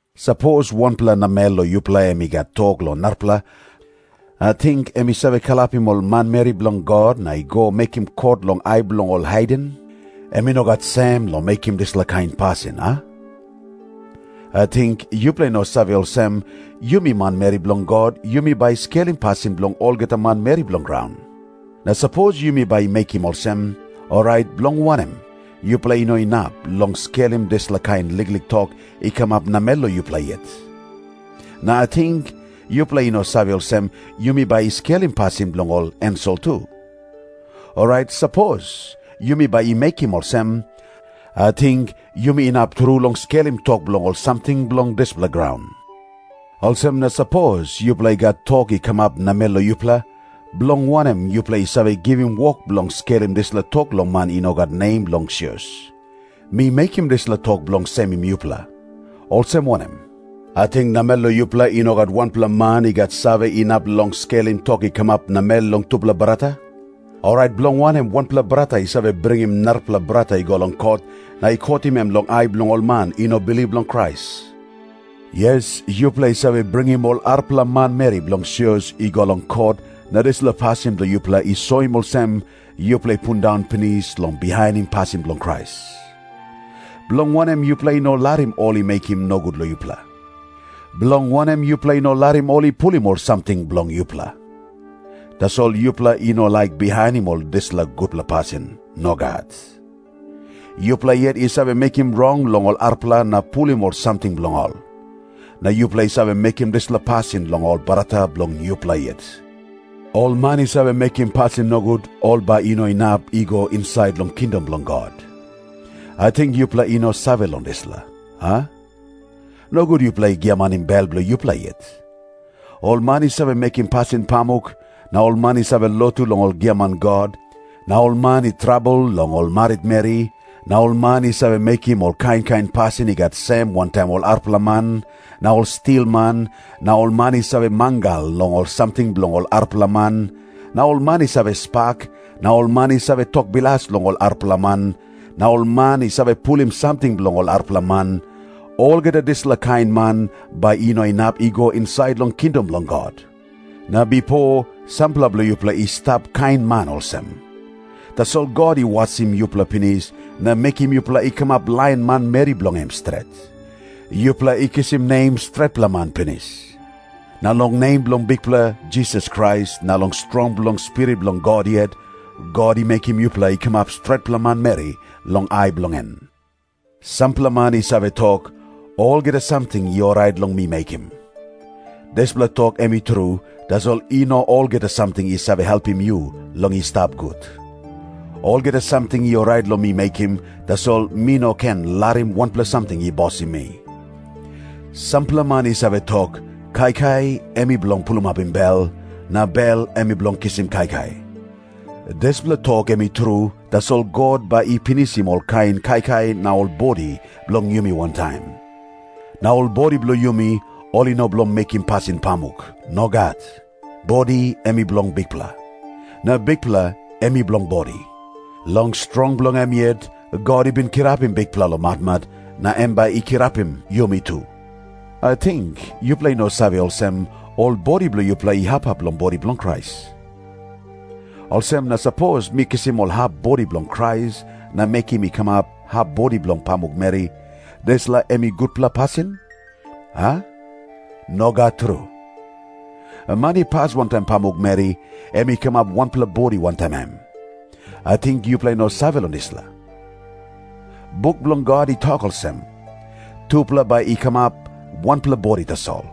Sapos wanpela namel long yupela em i gat tok long narapela, ating em i save kalapim ol manmeri bilong God na i go mekim kot long ai bilong ol haiden? Em i no gat sem long mekim dispela kain pasin, a? Ating yupela i no save olsem, yumi manmeri bilong God yumi bai i skelim pasin bilong olgeta manmeri bilong graun? Na sapos yumi bai i mekim olsem, orait bilong wanem yupela i no inap long skelim dispela kain liklik tok i kamap namel long yupela yet? Na ating yupela i no save olsem yumi bai i skelim pasin bilong ol ensel tu? Orait sapos yumi bai i mekim olsem, ating yumi inap tru long skelim tok bilong ol samting bilong dispela graun. Olsem na sapos yupela i gat tok i kamap namel long yupela, bilong wanem yupela i save givim wok bilong skelim dispela tok long man i no gat nem long sios? Mi mekim dispela tok bilong semim yupela. Olsem wanem? Ating namel long yupela i no gat wanpela man i gat save inap long skelim tok i kamap namel long tupela brata? Orait bilong wanem wanpela brata i save bringim narapela brata i go long kot, na i kotim em long ai bilong ol man i no bilip long Krais? Yes, yupela i save bringim ol arapela manmeri bilong sios i go long kot, na dispela pasin bilong yupela i soim olsem yupela i pundaun pinis long bihainim pasin bilong Krais. Bilong wanem yupela i no larim ol i mekim nogut long yupela? Bilong wanem yupela i no larim ol i pulim ol samting bilong yupela? Tasol yupela i no laik bihainim ol dispela gutpela pasin. Nogat. Yupela yet i save mekim rong long ol arapela na pulim ol samting bilong ol. Na yupela i save mekim dispela pasin long ol brata bilong yupela yet. Ol man i save mekim pasin nogut, ol bai i no inap i go insait long kingdom bilong God. Ating yupela i no save long dispela, a? Nogut yupela i giamanim bel bilong yupela yet. Ol man i save mekim pasin pamuk, na ol man i save lotu long ol giaman god, na ol man i trabel long ol maritmeri, na ol man i save mekim ol kain kain pasin i gat sem wantaim ol arapela man, na ol stilman, na ol man i save mangal long ol samting bilong ol arapela man, na ol man i save spak, na ol man i save tok bilas long ol arapela man, na ol man i save pulim samting bilong ol arapela man, olgeta dispela kain man bai i no inap i go insait long kingdom bilong God. Na bipo sampela bilong yupela i stap kain man olsem. Tasol God i wasim yupela pinis na mekim yupela i kamap lain manmeri bilong em stret. Yupela i kisim nem stretpela man pinis. Na long nem bilong Bikpela Jisas Krais na long strong bilong Spirit bilong God yet, God i mekim yupela i kamap stretpela manmeri long ai bilong en. Sampela man i save tok, “Olgeta samting i orait long mi mekim.” Dispela tok em i tru, tasol i no olgeta samting i save helpim yu long i stap gut. Olgeta samting i orait long mi mekim, tasol mi no ken larim wanpela samting i bosim mi. Sampela man i save tok, “Kaikai em i bilong pulimapim bel, na bel em i bilong kisim kaikai.” Dispela tok em i tru, tasol God bai i pinisim olkain kaikai na ol bodi bilong yumi wantaim. Na ol bodi bilong yumi, ol i no bilong mekim pasin pamuk. Nogat. Bodi em i bilong Bikpela. Na Bikpela em i bilong bodi. Long strong bilong em yet God i bin kirapim Bikpela long matmat, na em bai i kirapim yumi tu. Ating yupela i no save olsem, ol bodi bilong yupela i hap hap bilong bodi bilong Krais? Olsem na sapos mi kisim ol hap bodi bilong Krais na mekim i kamap hap bodi bilong pamukmeri, dispela em i gutpela pasin, a? Nogat tru. Man i pas wantaim pamukmeri, em i kamap wanpela bodi wantaim em. Ating yupela i no save long dispela? Buk bilong God i tok olsem, “Tupela bai i kamap wanpela bodi tasol.”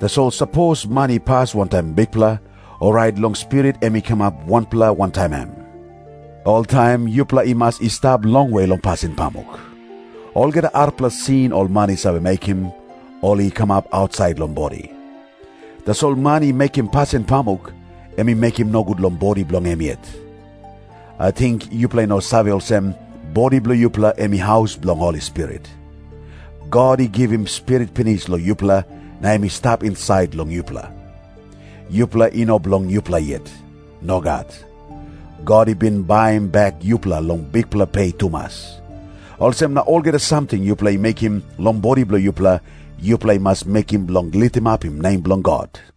Tasol sapos man i pas wantaim Bikpela, orait long spirit em i kamap wanpela wantaim em. Oltaim yupela i mas i stap longwe long pasin pamuk. Olgeta arapela sin ol man i save mekim, ol i kamap ausait long bodi. Tasol man i mekim pasin pamuk, em i mekim nogut long bodi bilong em yet. Ating yupela i no save olsem, bodi bilong yupela em i haus bilong Holi Spirit. God i givim Spirit pinis long yupela, na em i stap insait long yupela. Yupela i no bilong yupela yet. Nogat. God i bin baim bek yupela long bikpela pe tumas. Olsem na olgeta samting yupela i mekim long bodi bilong yupela, yupela i mas mekim bilong litimapim nem bilong God.